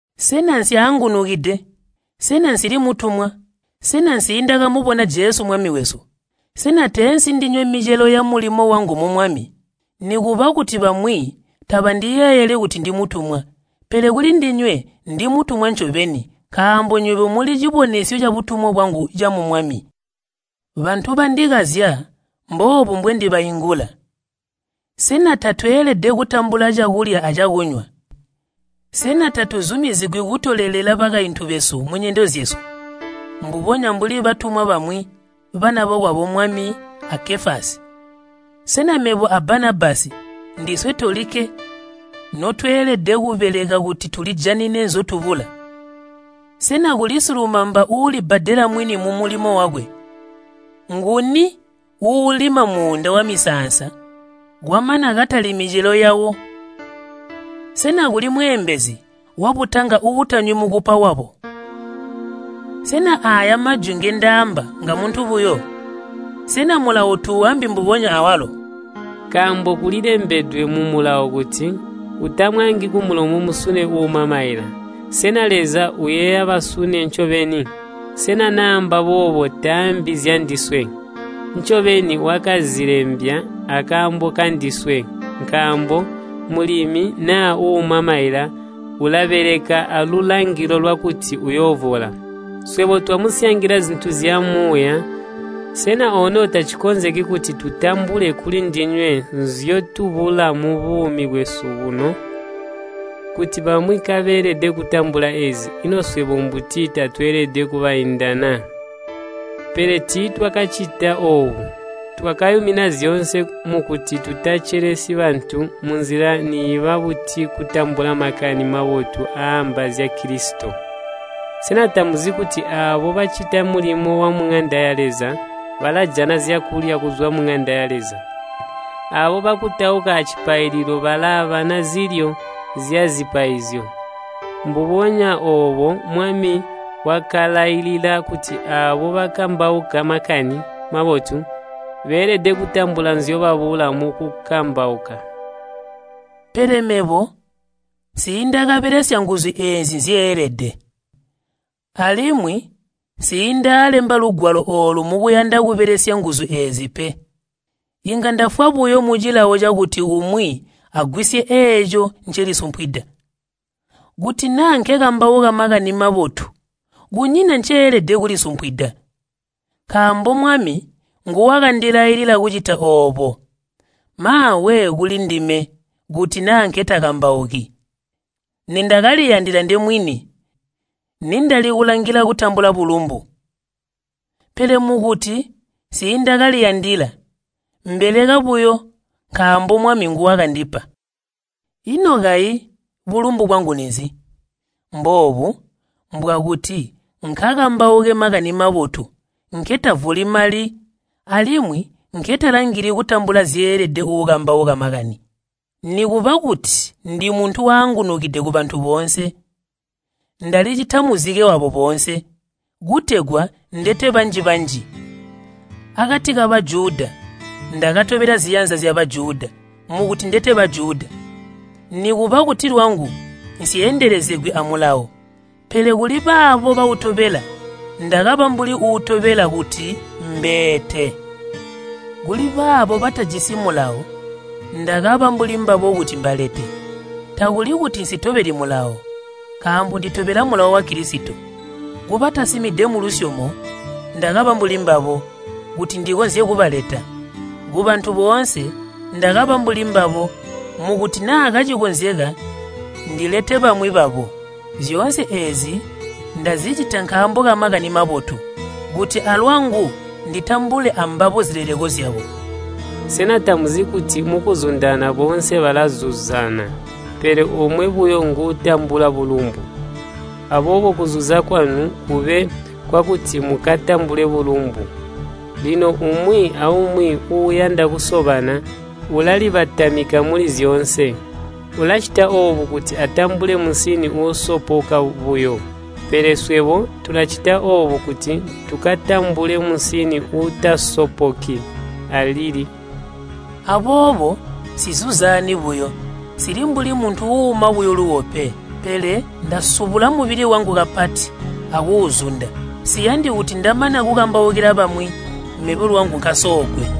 Sena nsyaangunukide? Sena nsili mutumwa? Sena nsiindaamubona Jesu Mwami wesu? Sena teensi ndinywe micelo yamulimo wangu mu Mwami? Nikuba kuti bamwi tabandiyeeyeli kuti ndimutumwa, pele kulindinywe ndi mutumwa ncobeni nkaambo nywebo muli cibonesyo cabutumwa bwangu camu Mwami. Bantu bandikazya mboobu bwendibaingula, Sena tatweelede kutambula cakulya acakunywa? Sena tatuzumizigwi kutolelela bakaintu besu munyendo zyesu, mbubonya mbuli batumwa bamwi, bana bokwabo Mwami a Kefasi? Sena mebo a Banabasi ndiswe tolikke notweelede kubeleka kuti tulijanine nzyotubula? Sena kuli silumamba uulibbadela mwini mumulimo wakwe? Nguni uulima muunda wamisaansa kwamana katalyi micelo yawo? Sena kuli mweeembezi wabutanga uutanywi mukupa wabo? Sena aaya majwi ngendaamba ngamuntu buyo? Sena Mulawo tuuambi mbubonya awalo? Nkaambo kulilembedwe mu Mulawo kuti, “Utamwaangi kumulomo musune uuuma maila.” Sena Leza uyeeya basune ncobeni? Sena naamba boobo, taambi zyandiswe? Ncobeni wakazilembya akaambo kandiswe, nkaambo mulimi naa uuuma maila ulabeleka alulangilo lwakuti uyoovola. Swebo twamusyangila zintu zyamuuya, sena ono tacikonzeki kuti tutambule kulindinywe nzyotubula mubuumi bwesu buno? Kuti bamwi kabeelede kutambula eezi, ino swebo mbuti tatweelede kubainda na? Pele tiitwakacita oobo. Twakayumina zyoonse mukuti tutacelesyi bantu munzila niiba buti kutambula Makani Mabotu aaamba zya Kilisito. Sena tamuzi kuti aabo bacita mulimo wamuŋanda ya Leza balajana zyakulya kuzwa muŋanda ya Leza, aabo bakutauka acipaililo balaabana zilyo zyazipaizyo? Mbubonya oobo, Mwami wakalailila kuti aabo bakambauka Makani Mabotu beelede kutambula nzyobabula mukukambauka. Pele mebo nsiindakabelesya nguzu eezi nzyeelede. Alimwi nsiindalemba lugwalo oolu mukuyanda kubelesya nguzu eezi pe. Inga ndafwa buyo mucilawo cakuti umwi agwisye eeco ncelisumpwida. Kuti naa nkekambauka Makani Mabotu kunyina nceelede kulisumpwida. Nkaambo Mwami nguwakandilailila kucita oobo. Maawe kulindime kuti naa nketakambauki. Nindakaliyandila ndemwini nindali kulangila kutambula bulumbu. Pele mukuti nsiindakaliyandila, mbeleka buyo nkaambo Mwami nguwakandipa. Ino kayi bulumbu bwangu ninzi? Mboobu, mbwakuti nkakambauke Makani Mabotu nketavoli mali alimwi nketalangili kutambula zyeelede uukambauka Makani. Nikuba kuti ndimuntu waangunukide kubantu boonse, ndalicita muzike wabo boonse, kutegwa ndete banji-banji. Akati ka Bajuda ndakatobela ziyanza zya Bajuda mukuti ndete Bajuda. Nikuba kuti lwangu nsyeendelezegwi a Mulawo, pele kuli baabo baitobela ndakaba mbuli wiitobela kuti mbeete. Kuli baabo batajisi Mulawo ndakaba mbuli mbabo kuti mbale. Takuli kuti nsitobeli Mulawo, nkaambo nditobela Mulawo wa Kilisito. Kubatasimide mulusyomo ndakaba mbuli mbabo, kuti ndikonzye kubaleta. Kubantu boonse ndakaba mbuli mbabo mukuti naa kacikonzeka ndilete bamwi babo. Zyoonse eezi ndazicita nkaambo ka Makani Mabotu, kuti alwangu nditambule ambabo zileleko zyawo. Sena tamuzi kuti mukuzundana boonse balazuzaana, pele omwe buyo nguutambula bulumbu? Aboobo kuzuza kwanu kube kwakuti mukatambule bulumbu. Lino umwi aumwi uuyanda kusobana ulalibatamika muli zyoonse. Ulacita oobo kuti atambule musini uusopoka buyo, pele swebo tulacita oobo kuti tukatambule musini uutasopoki alili. Aboobo nsizuzaani buyo, nsili mbuli muntu uuuma buyo luuwo pe. Pele ndasubula mubili wangu kapati akuuzunda, nsiyandi kuti ndamana kukambaukila bamwi, mebo lwangu nkasoogwe.